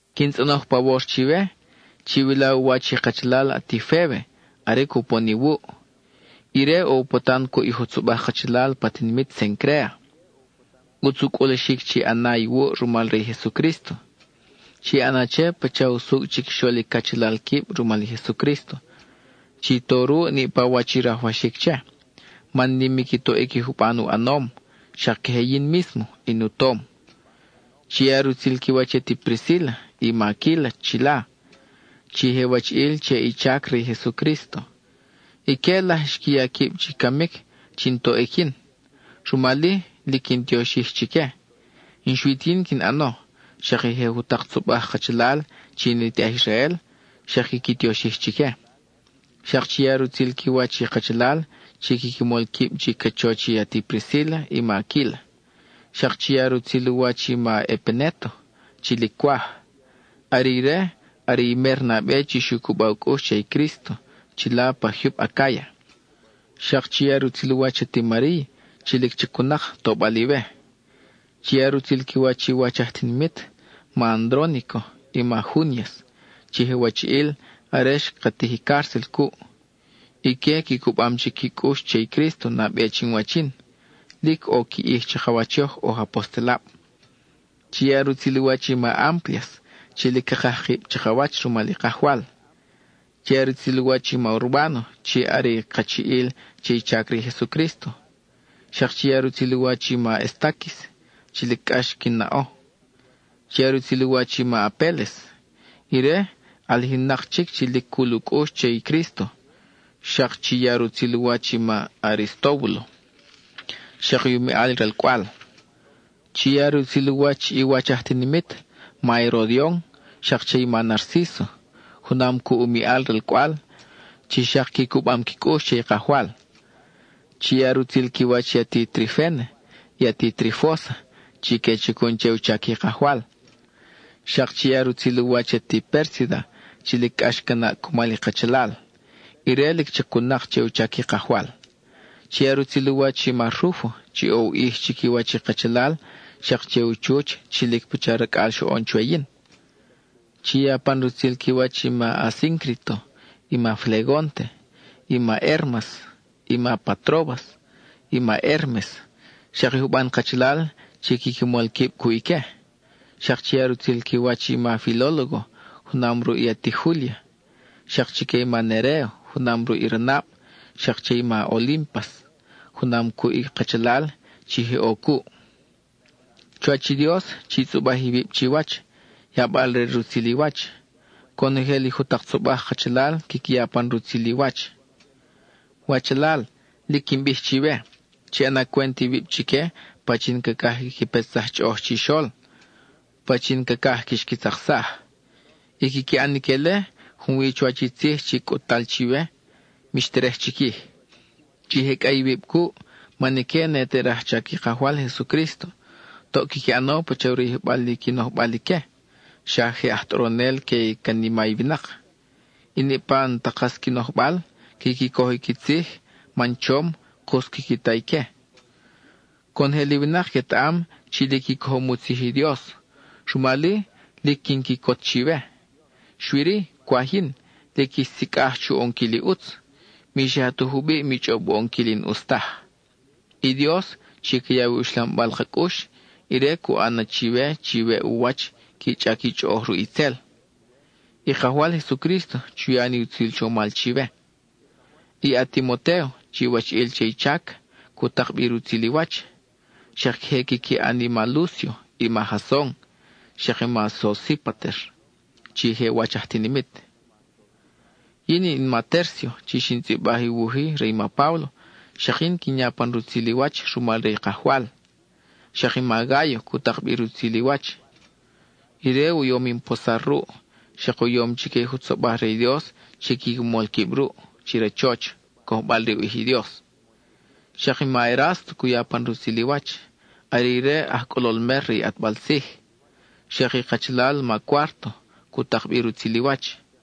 Quin tzʼonoj pawor chiwe, chiwila u wach i kachalal ati Fébe are cupon iwuʼ. Ire ʼo u patan cuʼ i jutzobaj kachalal pa tinimit Cencréa. ʼUtz u cʼulaxic chi ʼana iwuʼ rumal re i Jesucrísto. Chi ʼana che pacha usucʼ chiquixol i cachalal quib rumal i Jesucrísto. Chi to ruʼ niʼpa wach i rajwaxic che, man nim i qui toʼic i juban u ʼanom, xak queje yin mísmo, in u tom. Chi ya rutzil qui wach i ati Priscíla i ma Aquíla chila, chi je wachiʼil che i chac re i Jesucrísto. Ique laj xqui ya quib chi camic chin toʼic yin, rumal-i, lic quin tioxij chique; n-xui ti yin quin ʼano, xak i je jutak tzobaj kachalal chi ne te aj Israel, xak quiqui tioxij chique. Xak chi ya rutzil qui wach i kachalal chi quiqui mol quib chi cachoch i ati Priscíla i ma Aquíla; xak chi ya rutzil u wach i ma Epenéto chi lic cwaj. Are ire are i mer nabe xu cuba u cʼux che i Crísto chila pa jyub Acáya. Xak chi ya rutzil u wach i ati Mariy, chi lic chacun-nak tobal iwe. Chi ya rutzil qui wach i wach aj tinimit, ma Andrónico y ma Júnias, chi je wachiʼil are xka tij i cárcel cuʼ. Ique qui cubam chic qui cʼux che i Crísto nabe chin wach yin; lic ʼo qui ʼij chakawach yoj oj apostelab. Chi ya rutzil u wach i ma Amplias chi lic cakaj kib chakawach rumal i Kajwal. Chi ya rutzil u wach i ma Urbáno chi are kachiʼil che i chac re i Jesucrísto. Xak chi ya rutzil u wach i ma Estáquis chi lic cʼax quin naʼo. Chi ya rutzil u wach i ma Apéles. Ire, ʼalijin-nak chic chi lic cul u cʼux che i Crísto. Xak chi ya rutzil u wach i ma Aristóbulo, xak i u miʼal ralcʼwal. Chi ya rutzil u wach i wach aj tinimit, ma Herodion, xak che i ma Narcíso junam cuʼ u miʼal ralcʼwal, chi xak qui cubam qui cʼux che i Kajwal. Chi ya rutzil qui wach i ati Triféna, i ati Trifósa, chi que chacun che u chac i Kajwal. Xak chi ya rutzil u wach i ati Pérsida chi lic cʼax ca naʼ cumal i kachalal; ire lic chacun-nak che u chac i Kajwal. Chi ya rutzil u wach i ma Rúfo chi ʼo u ʼij chiquiwach i kachalal, xak che i u chuch chi lic pacha racʼal xoʼon chwe yin. Chi ya pan rutzil qui wach i ma Asíncrito, i ma Flegónte, i ma Hérmas, i ma Patróbas, i ma Hérmes, xak i juban kachalal chi quiqui mol quib cuʼ ique. Xak chi ya rutzil qui wach i ma Filólogo junam ruʼ i ati Júlia; xak chique i ma Neréo junam ruʼ i ranab, xak che i ma Olímpas junam cuʼ i kachalal chi je ʼo cuʼ. Chuwach i Dios, chi tzʼubaj iwib chiwach, yabal-re rutzil i wach. Conojel i jutak tzobaj kachalal quiqui ya pan rutzil i wach. Wachalal, lic quin bij chiwe, chi ʼana cwent iwib chique pachin cacaj quiqui petsaj chʼoʼoj chixol, pachin cacaj quix qui tzaksaj. I quiqui ʼan ique-le, junwi chuwach i tzij chi cʼut-tal chiwe, mix terej chiquij. Chi jecʼa iwib cuʼ man ique ne te rajchac i Kajwal Jesucrísto. Toʼ quiqui ʼano pacha u rayijbal i qui nojbal ique, xa je aj tʼoronel que i canima i winak. I niʼpa i n-ta kas qui nojbal, quiqui coj i qui tzij man chom, kus quiqui ta ique. Conojel i winak quetaʼam chi lic i cojom i u tzij i Dios, rumal-i, lic quin quicot chiwe. Xui-ri, cwaj yin, lic ix sicʼaj chu ʼonquil i ʼutz; mi xa ta jubiʼ mi chʼob u ʼonquil i n-ʼus taj. I Dios, chi ca yaw i uxlambal ka cʼux, ire cu ʼan na chiwe chi weʼ u wach qui chʼac i chʼoʼoj ruʼ itzel. I Kajwal Jesucrísto chu ya ni utzil chomal chiwe. I a-Timotéo, chi wachiʼil che i chac, cu tak bi rutzil i wach. Xak queje quiqui ʼan i ma Lúcio, i ma Jason, xak i ma Sosípater chi je wach aj tinimit. (Yin in ma Tércio chi xin tzʼibaj i wuj-i re i ma Páblo; xak yin quin ya pan rutzil i wach rumal re i Kajwal.) Xak i ma Gáyo cu tak bi rutzil i wach. Ire u yom in posar ruʼ, xak u yom chique i jutzobaj re i Dios quiqui mol quib ruʼ, chi rachoch, cojbal re u ʼij i Dios. Xak i ma Erásto cu ya pan rutzil i wach, are ire i aj cʼolol mer re i ʼatbal tzij. Xak i kachalal ma Cuárto cu tak bi rutzil i wach.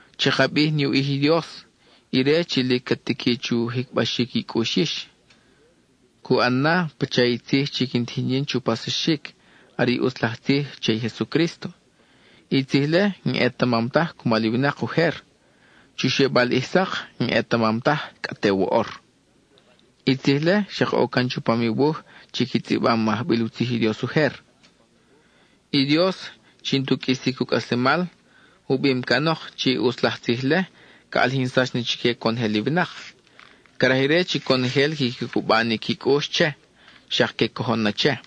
Chaka bij ni u ʼij i Dios, ire chi lic ca tiqui chu jicbaxic i cʼux yix. Cu ʼan na, pacha i tzij chi quin tijin yin chu paxsaxic, are i ʼutz laj tzij che i Jesucrísto. I tzij-le, n-ʼetamam taj cumal i winak ujer; chu xebal ʼij sak, n-ʼetamam taj cʼa te woʼor. I tzij-le xak ʼo can chupam i wuj chi qui tzʼibam i ajbil u tzij i Dios ujer. I Dios, chi n-tu qʼuisic u cʼaslemal, u bim canok chi i ʼutz laj tzij-le ca ʼalijinsax na chique conojel i winak. Craj ire chi conojel quiqui cuba ni qui cʼux che, xak que cojon na che.